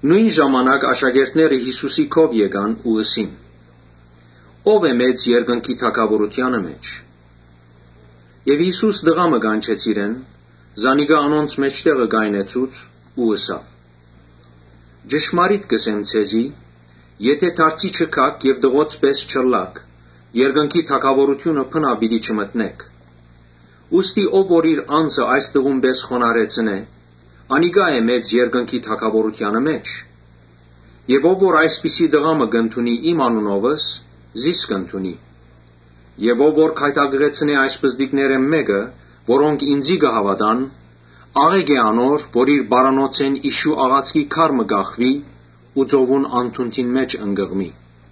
Նոյն ժամանակ աշակերտները Յիսուսին քով եկան ու ըսին. «Ո՞վ է մեծ երկնքի թագաւորութեանը մէջ»։ Եւ Յիսուս տղայ մը կանչեց իրեն, զանիկա անոնց մէջտեղը կայնեցուց Ու ըսաւ. «Ճշմարիտ կ’ըսեմ ձեզի, ‘Եթէ դարձի չգաք եւ տղոց պէս չըլլաք, երկնքի թագաւորութիւնը բնաւ պիտի չմտնէք’։ Ուստի ով որ իր անձը այս տղուն պէս խոնարհեցնէ, անիկա է մեծ երկնքի թագաւորութեանը մէջ, Եւ ով որ այսպիսի տղայ մը կ’ընդունի իմ անունովս, զիս կ’ընդունի»։ «Ով որ գայթակղեցնէ այս պզտիկներէն մէկը, որոնք ինծի կը հաւատան, աղէկ է անոր՝ որ իր պարանոցէն իշու աղացքի քար մը կախուի ու ծովուն անդունդը ընկղմի»։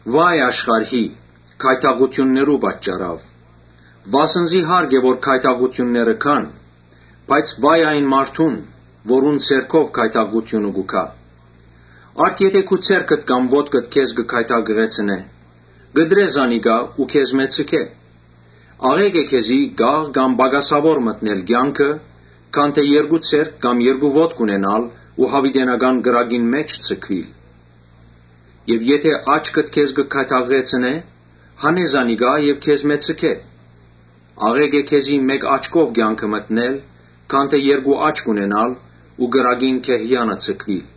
«Վա՜յ աշխարհի՝ գայթակղութիւններուն պատճառաւ, վասն զի հարկ է որ գայթակղութիւնները գան, բայց վա՜յ այն մարդուն՝ որուն ձեռքով գայթակղութիւնը կու գայ։ Արդ՝ եթէ քու ձեռքդ կամ ոտքդ քեզ կը գայթակղեցնէ, կտրէ զանիկա ու քեզմէ ձգէ. աղէկ է քեզի կաղ կամ պակասաւոր մտնել կեանքը, քան թէ երկու ձեռք կամ երկու ոտք ունենալ ու յաւիտենական կրակին մէջ ձգուիլ։ Եթէ աչքդ քեզ կը գայթակղեցնէ, հանէ զանիկա եւ քեզմէ ձգէ. աղէկ է քեզի մէկ աչքով կեանքը մտնել, քան թէ երկու աչք ունենալ ու կրակին գեհեանը ձգուիլ»։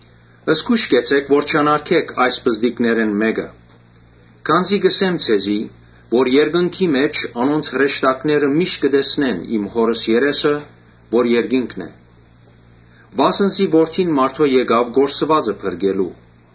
«Զգոյշ կեցէք որ չանարգէք այս պզտիկներէն մէկը. քանզի կ’ըսեմ ձեզի թէ երկնքի մէջ անոնց հրեշտակները միշտ կը տեսնեն իմ Հօրս երեսը՝ որ երկինքն է։ Վասն զի Որդին մարդոյ եկաւ կորսուածը փրկելու։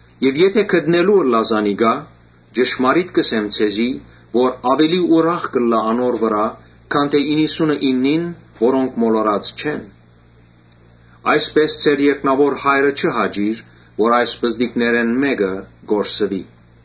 Եթէ գտնելու ըլլայ, ճշմարիտ կ’ըսեմ ձեզի, որ աւելի ուրախ կ’ըլլայ անոր վրայ, քան թէ իննսունըիննին՝ որոնք մոլորած չէին։ Այսպէս, ձեր երկնաւոր Հայրը չի հաճիր որ այս պզտիկներէն մէկը կորսուի’»։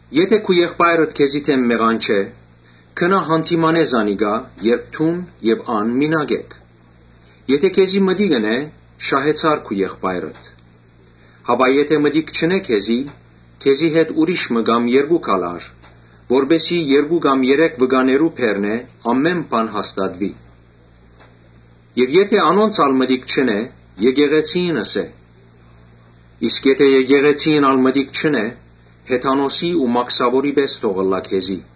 «Եթէ քու եղբայրդ քեզի դէմ մեղանչէ, գնա յանդիմանէ զանիկա երբ դուն եւ ան մինակ էք. եթէ քեզի մտիկ ընէ, շահեցար քու եղբայրդ։ Բայց եթէ մտիկ չընէ քեզի, քեզի հետ ուրիշ մը կամ երկուք ալ առ, որպէս զի երկու կամ երեք վկաներու բերնով ամէն բան հաստատուի։ Եթէ անոնց ալ մտիկ չընէ, եկեղեցիին ըսէ. իսկ եթէ եկեղեցիին ալ մտիկ չընէ, հեթանոսի ու մաքսաւորի պէս թող ըլլայ քեզի»։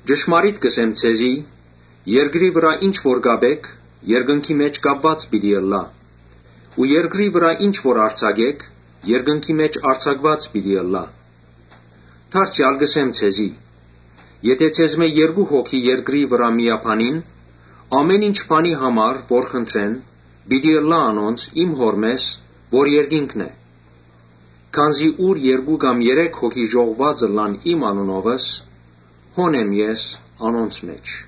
«Ճշմարիտ կ’ըսեմ ձեզի, ‘Երկրի վրայ ինչ որ կապէք, երկնքի մէջ կապուած պիտի ըլլայ ու երկրի վրայ ինչ որ արձակէք, երկնքի մէջ արձակուած պիտի ըլլայ’։ Դարձեալ կ’ըսեմ ձեզի. ‘Եթէ ձեզմէ երկու հոգի երկրի վրայ միաբանին, ամէն ինչ բանի համար որ խնդրեն, պիտի ըլլայ անոնց իմ Հօրմէս որ երկինքն է’։ Քանզի ուր երկու կամ երեք հոգի ժողուած ըլլան իմ անունովս, հոն եմ ես անոնց մէջ»։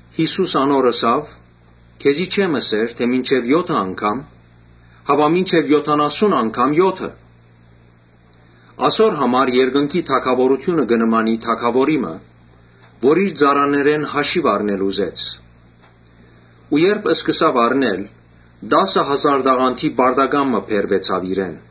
Յիսուս ըսաւ անոր. «Քեզի չեմ ըսեր թէ մինչեւ եօթը անգամ, հապա մինչեւ եօթանասուն անգամ եօթը։ Ասոր համար երկնքի թագաւորութիւնը կը նմանի թագաւորի մը որ իր ծառաներէն հաշիւ առնել ուզեց։ Երբ սկսաւ հաշիւ առնել, տասը հազար տաղանդի պարտական մը բերուեցաւ իրեն։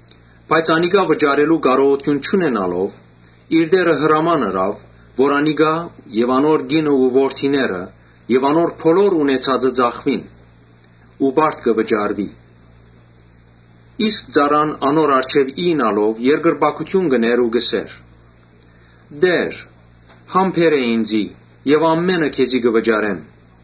Բայց անիկա վճարելու կարողութիւն չունենալով՝ իր տէրը հրաման ըրաւ որ զանիկա եւ անոր կինը ու որդիները եւ անոր բոլոր ունեցածը ծախուին ու պարտքը վճարուի։ Իսկ ծառան անոր առջեւ իյնալով երկրպագութիւն ըրաւ ու ըսաւ. ‘Տէ՛ր, համբերէ ինծի եւ ամէնը քեզի վճարեմ’։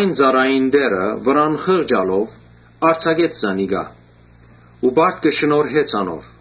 Ծառային տէրը վրան խղճալով արձակեց զանիկա ու պարտքը շնորհեց անոր։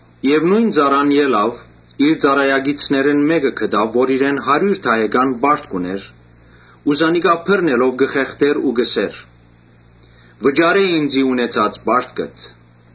Նոյն ծառան ելաւ, իր ծառայակիցներէն մէկը գտաւ որ իրեն հարիւր դահեկան պարտք ունէր ու զանիկա բռնելով կը խեղդէր ու կ’ըսէր. ‘Վճարէ ինծի ունեցած պարտքդ’։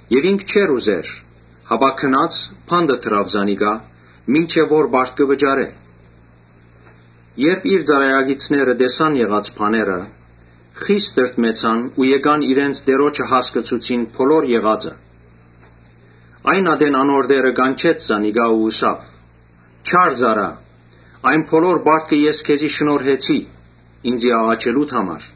Բայց ինք չէր ուզեր, հապա գնաց՝ բանտը դնել տուաւ, մինչեւ որ պարտքը վճարէ։ Երբ իր ծառայակիցները տեսան եղած բաները, խիստ տրտմեցան ու եկան իրենց տիրոջը իմացուցին բոլոր եղածը։ Այն ատեն անոր տէրը կանչեց զանիկա ու ըսաւ. ‘Չա՛ր ծառայ, այն բոլոր պարտքը ես քեզի շնորհեցի՝ ինծի աղաչելուդ համար.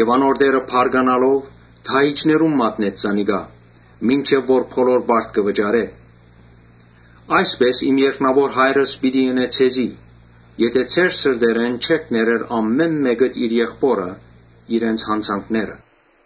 Անոր տէրը բարկանալով՝ դահիճներուն մատնեց զանիկա, մինչեւ որ բոլոր պարտքը վճարէ։ Այսպէս իմ երկնաւոր Հայրս պիտի ընէ ձեզի եթէ ձեր սրտերէն չներէք ամէն մէկդ իր եղբօրը յանցանքները»։